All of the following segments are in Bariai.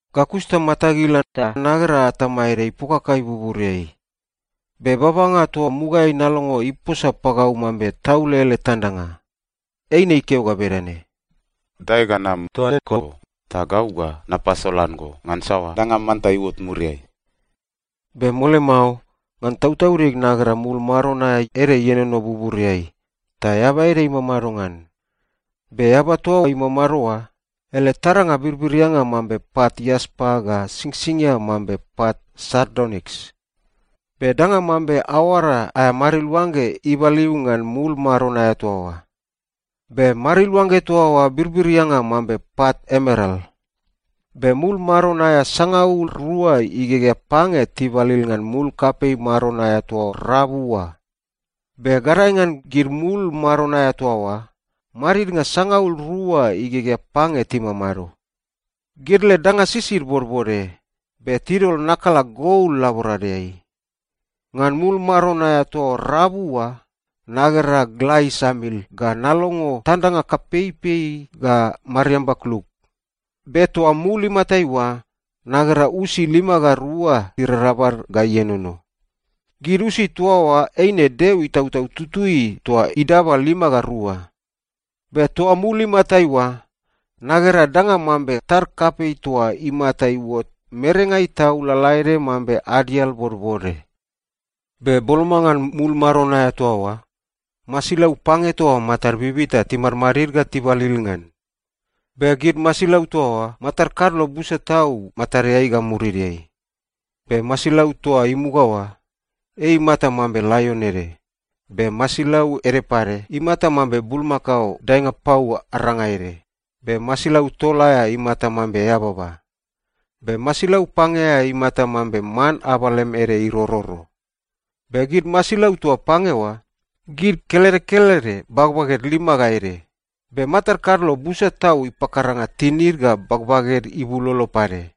Ga kus ta matag ila ta nagera atama ede ipokakai buburiai. Be babanga toa mugaeai nalongo iposa pagau mambe taule ele tandanga, eine ikeo ga bedane, “Dae ga nam toa eko, ta gau ga napasolan go ngan saoa danga manta iuot muriai.” Be mole mao, ngan tautaudig nagera mul maron aea ede ienono buburiai, ta Eaba ede imamado ngan. Be Eaba toa imamado oa, ele taranga birbirianga mambe pat iaspa ga singsingia mambe pat sardoniks. Be danga mambe aoara aea mariluangge ibaliu ngan mul maron aea toa oa. Be mariluangge toa oa birbirianga mambe pat emeral. Be mul maron aea sangaul rua igegea pange tibalil ngan mul kapei maron aea toa rabu oa. Be gadae ngan gid mul maron aea toa oa, madidnga sangaul rua igegea pange timamado. Gid led danga sisid bodbode, be tidol nakala gol laboradeai. Ngan mul maron aea toa rabu oa, nagera gla isamil ga nalongo tandanga kapeipei ga mariamba kluk. Be toa mul imatai oa, nagera usi lima ga rua irarabal ga ienono. Gid usi toa oa eine Deo Itautau Tutui toa idaba lima ga rua. Be toa mul imatai oa, nagera danga mambe tad kapei toa imata iuot merengai tau lalaede mambe adial bodbode. Be boloma ngan mul maron aea toa oa, masilau pange toa matad bibita timadmadid ga tibalil ngan. Be gid masilau toa oa, matad kadlo busa tau matadeai ga murideai. Be masilau toa imuga oa, ei imata mambe laion ede, be masilau ede pade imata mambe bulmakao daenga pau aranga ede, be masilau tol aea imata mambe eababa, be masilau pange aea imata mambe man abalem ede irororo. Be gid masilau toa pange oa, gid kelede kelede bagbaged lima ga ede, be matad kadlo busa tau ipakaranga tinid ga bagbaged ibulolo pade.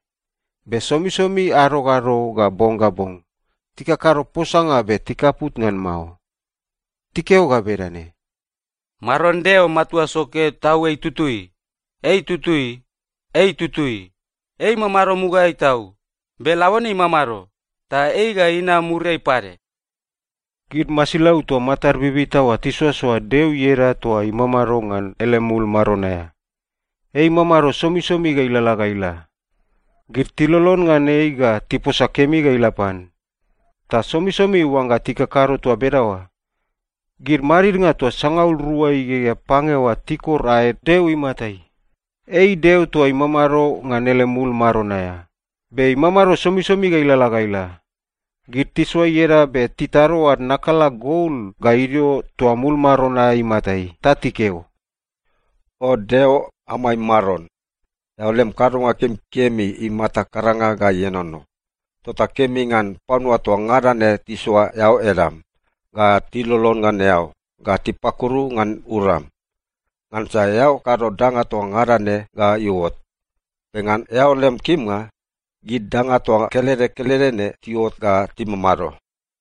Be somisomi ado ga ado ga bong ga bong, tikakado posanga be tikaput ngan mao. Tikeo ga bedane, “Maron Deo Matua Soke Tau ei tutui, ei tutui, ei tutui. Ei imamado mugaeai tau, be labone imamado, ta ei ga inam muriai pade.” Gid masilau toa matad bibita oa tisoasoa Deo ieda toa imamado ngan ele mul maron aea. Ei imamado somisomi ga ilalala ga ila. Gid tilolon ngan ei ga tiposa kemi ga ila pan. Ta somisomi oangga tikakado toa bedaoa, gid madidnga toa sangaul rua igegea pange oa tikor aed Deo imatai. Ei Deo toa imamado ngan ele mul maron aea, be imamado somisomi ga ilalala ga ila. Gid tisoa ieda be titatado ad nakala gol ga idio toa mul maron aea imatai. Ta tikeo, “O Deo amai Maron, eao lem kadonga kemikemi imata karanga ga ienono! Tota kemi ngan panua toa ngada ne tisoa eao edam, ga tilolon ngan eao, ga tipakuru ngan uram. Ngansa eao kado danga toa ngada ne ga iuot. Be ngan eao lem kimnga, gid danga toa kelede kelede ne tiuot ga timamado.”